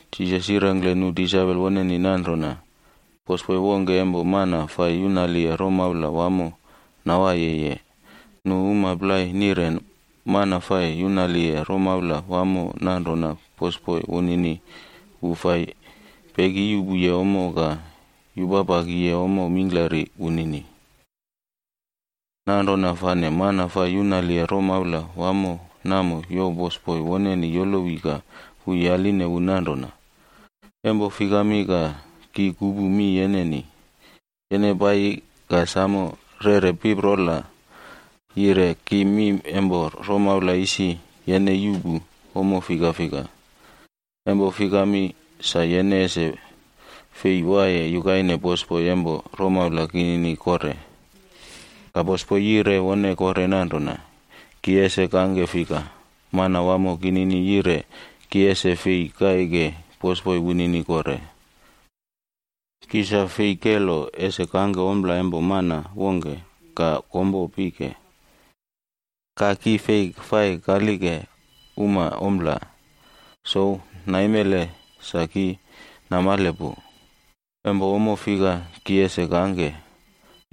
Jisas yirengkle nu disaipol woneni nanrona, “Bosboi wongke empo mana fai yunaliye romaula wamo nawaiyeye. Nu uma plai nireni mana fai yunaliye romaula wamo nanrona bosboi wunini wu fai pekiyuꞌpuye ommo ka yupapakiye ommo mingklari wunini. Nanrona fane mana fai yunaliye romaula wamo namo youw bosboi woneni yolowi ka wu yaline wu nanrona, ‘Empo fikami ka ki kupu mi yeneni? Yene paiyi ka samo yeꞌre piparola yire ki mi empo romaula isi yene yuꞌpu ommo fika fika. Empo fikami, sa yene ese fei waiye yukaine bosboi empo romaula kinini kore.’ “Ka bosboi yire wone kore nanrona, ‘Ki ese kangke fika? Manawamo kinini yire ki ese fei kaike bosboi wunini kore. Ki sa fei kelo ese kangke ompla empo mana wongke ka kompo pike. Ka ki fei fai kalileke uma ompla. Souw naimele sa ki namale pu, empo ommo fika ki ese kangke,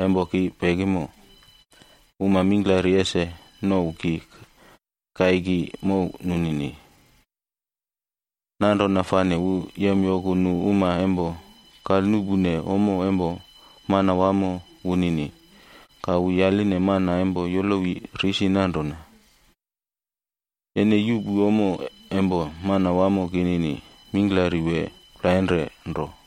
empo ki pekimo, uma mingklari ese nouw ki kaiki mow nunini.’ “Nanrona fane wu yemyoku nu uma empo kalnuꞌpune ommo empo manawamo wunini. Ka wu yaline mana empo yolowi risi nanrona, ‘Yene yuꞌpu ommo empo manawamo kinini mingklari wee plainre nro?’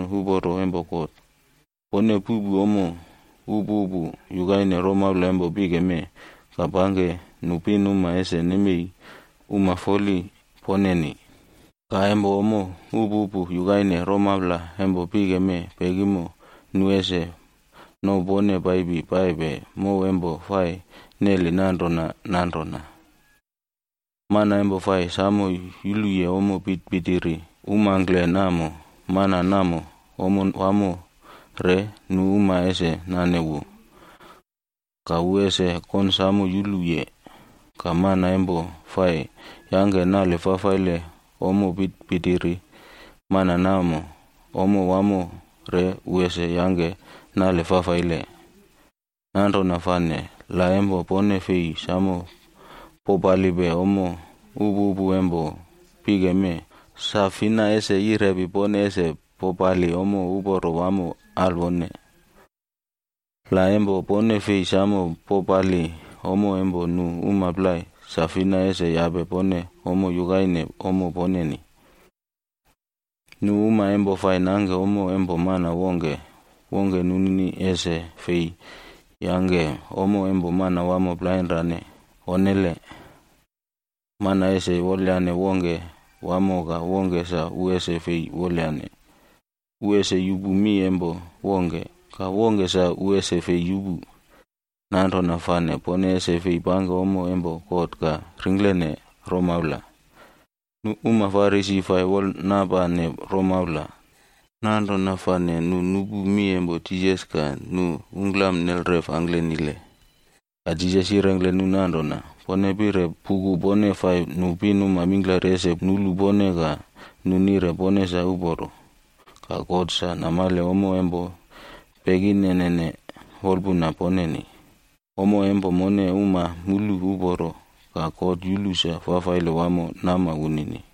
Ki kire mi alwone pone, pone puꞌpu ommo upupu yukaine romaula empo pike mee, ka pangke nu pinuma ese nemei uma foli poneni. Ka empo ommo upupu yukaine romaula empo pike mee pekimo, nu ese nouw pone paipi paipe mow empo fai neli nanrona nanrona. “Mana empo fai samo yuluye ommo pitipitiri umangkle namo, mana namo ommo wamo re nu uma ese nane wu, ka wu ese konsamo yuluye. Ka mana empo fai yangke nale fafaile ommo pitipitiri, mana namo, ommo wamo re wu ese yangke nale fafaile. Nanrona fane la empo pone fei samo popalipe ommo upupu empo pike mee, sa fina ese yirepi pone ese popali ommo uporo wamo alwone? La empo pone fei samo popali ommo empo nu uma plai, sa fina ese yape pone ommo yukaine ommo poneni? “Nu uma empo fai nangke ommo empo mana wongke, wongke nunini ese fei yangke ommo empo manawamo plainrane, onnele. Mana ese wolyane wongke wamo ka wongke sa wu ese fei wolyane. Wu ese yupu mi empo wongke, ka wongke sa wu ese fei yupu. Nanrona fane pone ese fei pangke ommo empo God ka ringklene romaula.” Nu uma Farisi fai wolnapane romaula. Nanrona fane nu nupu mi empo Jisas ka nu ungklam nelref angklenile. Ka Jisas yirengkle nu nanrona, “Pone pire puku pone fai nu pinuma mingklari ese nulu pone ka nu nire pone sa uporo. Ka God sa namale ommo empo pekinenene wolpuna poneni. Ommo empo mone uma mulu uporo, ka God yulu sa fafaile wamo nama wunini.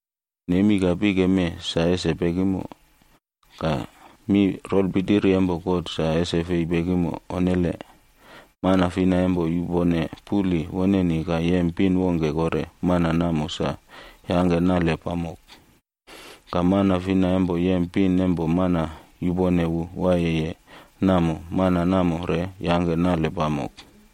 Nemi ka pike mee sa ese pekimo, ka mi rolpitiri empo lo empo God sa ese fei pekimo. Onnele! “Mana fina empo yupone puli woneni ka yem pin wongke kore, mana namo sa yangke nale pamok. Ka mana fina empo yem pin empo mana yupone wu waiyeye namo, mana namo re yangke nale pamok.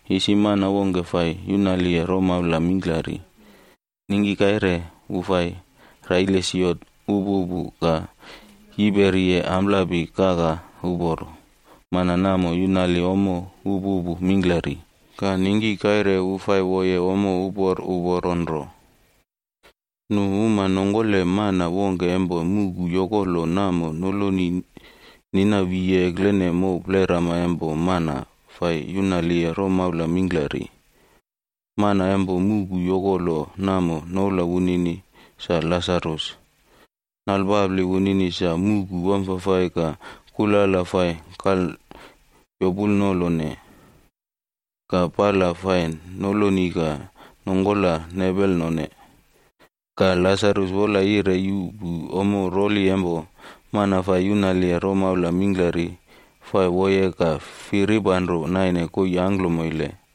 “Isi mana wongke fai yunaliye romaula mingklari, ningki kaire wu fai raile siot upupu ka yiperiye amplapi kaka uporo. Mana namo yunali ommo upupu mingklari. Ka ningki kaire wu fai woye ommo upor uporo nro. Nu uma nongkole mana wongke empo muꞌku yokolo namo noloni nina wiye eklene mow plerama empo mana fai yunaliye romaula mingklari. Mana empo muꞌku yokolo namo noula wunini sa Lasarus. Nalpapli wunini sa muꞌku wamfafai ka kulala fai kalyopulnolone, ka pala fai noloni ka nongkola nepelnone. Ka Lasarus wola yire yuꞌpu ommo roli empo mana fai yunaliye romaula mingklari fai woye ka firipanro naine koii angklomoile.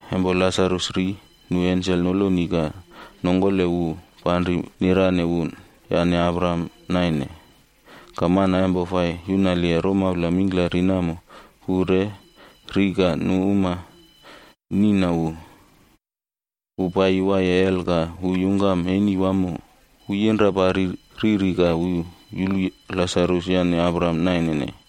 “Empo Lasarus ri, nu ensel nolo ka nongkole wu panri nirane wu yane Abraham naine.c Ka mana empo fai yunaliye romaula mingklari namo wu re ri ka nu uma niꞌna wu. Wu paiyi waiye hel ka wu yungkam eni wamo. Wu yinrapari riri ka wu yulu Lasarus yane Abraham nainene.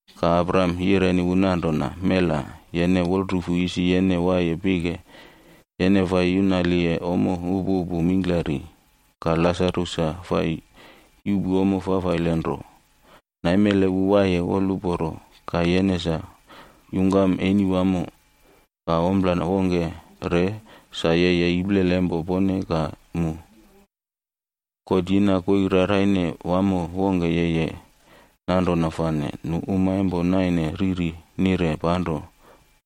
“Ka Abraham yireni wu nanrona, ‘Mela! Yene wolrufu isi yene waiye pike, yene fai yunaliye ommo upupu mingklari. Ka Lasarus sa fai yuꞌpu ommo fafaile nro. Naimele wu waiye woluporo ka yene sa yungkam eni wamo. Ka ompla wongke re, sa yeye iplele empo pone ka mu, God yina koii raraine wamo wongke yeye. Nanrona fane, nu uma empo naine riri nire panro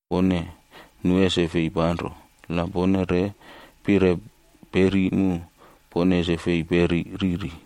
pone, nu ese fei panro. La pone re pire peri mu, pone ese fei peri riri.’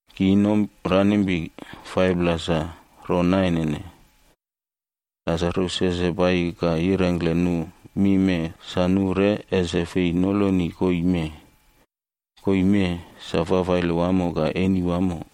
Ki inomranimpi 5pla sa ronainene. Lasarus ese paiyi ka yirengkle nu mi mee sa nu re ese fei noloni koii mee. Koii mee sa fafaile wamo ka eni wamo.’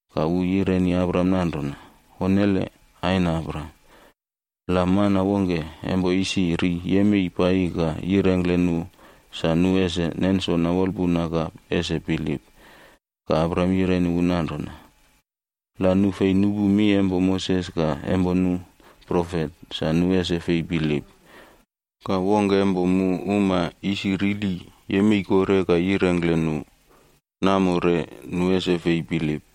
“Ka wu yireni Abraham nanrona, ‘Onnele! Aina Abraham, la mana wongke empo isi ri yemei paiyi ka yirengkle nu sa nu ese nensona wolpuna ka ese bilip.’ “Ka Abraham yireni wu nanrona, ‘La nu fei nupu mi empo Moses ka empo nu profet, sa nu ese fei bilip. Ka wongke empo mu uma isi rili yemei kore ka yirengkle nu, namo re nu ese fei bilip.’”